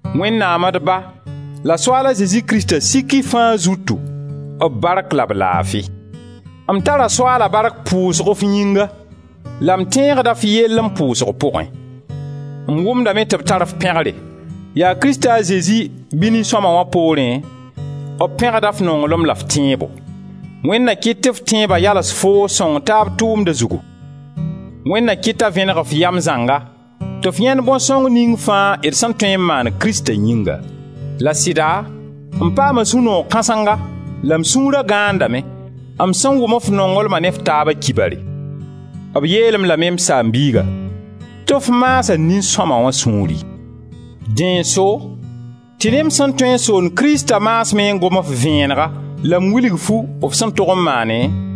Wẽnnaam d Ba la Soaala Zezi Krista sik y fãa zutu b bark la b laafi! M tara Soaala bark pʋsgo f yĩnga la m tẽegda f yell m pʋʋsg pʋgẽ. M wʋmdame tɩ b tar-f pẽgre. Yaa Krista a Zezi bɩ nin-sõma wã poorẽ, b pẽgda f nonglem la f tẽebo. Wẽnd na kɩt tɩ f tẽeba yals foo sõng-taab-tʋʋmda zugu. Wẽnd na kɩt t'a vẽneg f yam zãnga tɩ f yãend bõn sõng ning fãa d sẽn tõe n maan Krista yĩnga. La sɩda m paama sũ-noog kãsenga la m sũura gãandame, m sẽn wʋm f nonglma ne f taaba kibare; b yeel-m lame, m saam-biiga, tɩ f maasa nin-sõma wã sũuri. Dẽ n so tɩ ne m sẽn tõe n soond Krista maasmẽ n gom-f vẽenega la m wilg-fu f sẽn tog n maane,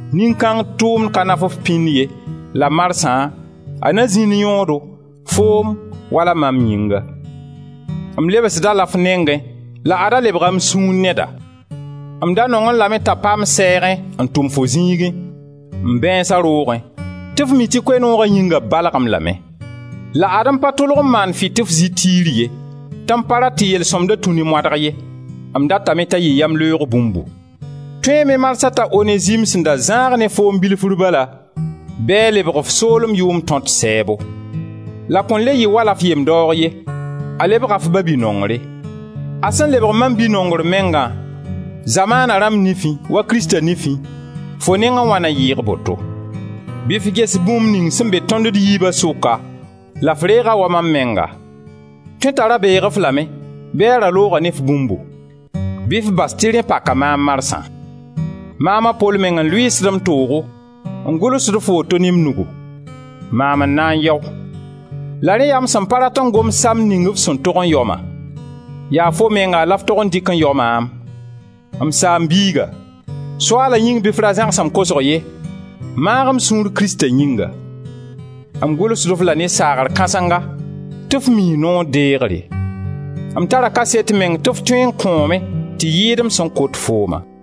Nin-kãng tʋʋmd ka naf-f pĩnd ye la marsã a na zĩnd yõodo, foo wala mam yĩnga. M lebsd-a la f nengẽ la ad-a lebga m sũur neda. M da nongẽ lame t'a pa m sɛɛgẽ n tʋm fo ziigẽ, m bãeensa roogẽ, tɩ f mi tɩ Koe-nooga yĩnga b balg-m lame. La ad-m pa tʋlg n maan fɩ tɩ f zɩ tiir ye, tɩ m pa rat tɩ yel-sõmda tũ ne moadg ye; m datame t'a yɩ yamleoog bũmbu. Tõeeme marsã t'a Onezim sẽn da zãag ne foom bilfr bala bɩ a lebg f soolem yʋʋm tõt sɛɛbo. La kõn le yɩ wala f yem-daoog ye, a lebga f babi-nongre. A sẽn lebg mam bi-nongr mengã, zamaana rãmb nifẽ, wa Krista nifẽ, fo nengẽ wã na yɩɩg boto. Bɩ f ges bũmb ning sẽn be tõnd d yiiba sʋka la f reeg-a wa mam menga. Tõe t'a ra beeg-f lame bɩ a ra looga ne f bũmbu, bɩ f bas tɩ rẽ paka maam marsã. Maam a Pol meng n lʋɩɩsd m toogo, n gʋlsd-f woto ne m nugu: maam n na n yao. La rẽ yaa m sẽn pa rat n gom samd ning f sẽn tog n yao-ma; yaa fo menga la f tog n dɩk n yao maam. M saam-biiga, Soaala yĩng bɩ f ra zãgs m kosg ye; maag m sũur Krista yĩnga. M gʋlsd-f la ne saagr kãsenga tɩ f mii noor deegre; m tara kaset meng tɩ f tõe n kõome tɩ yɩɩd m sẽn kot fooma.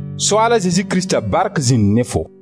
Soaala a Zezi Krista bark zĩnd ne-fo!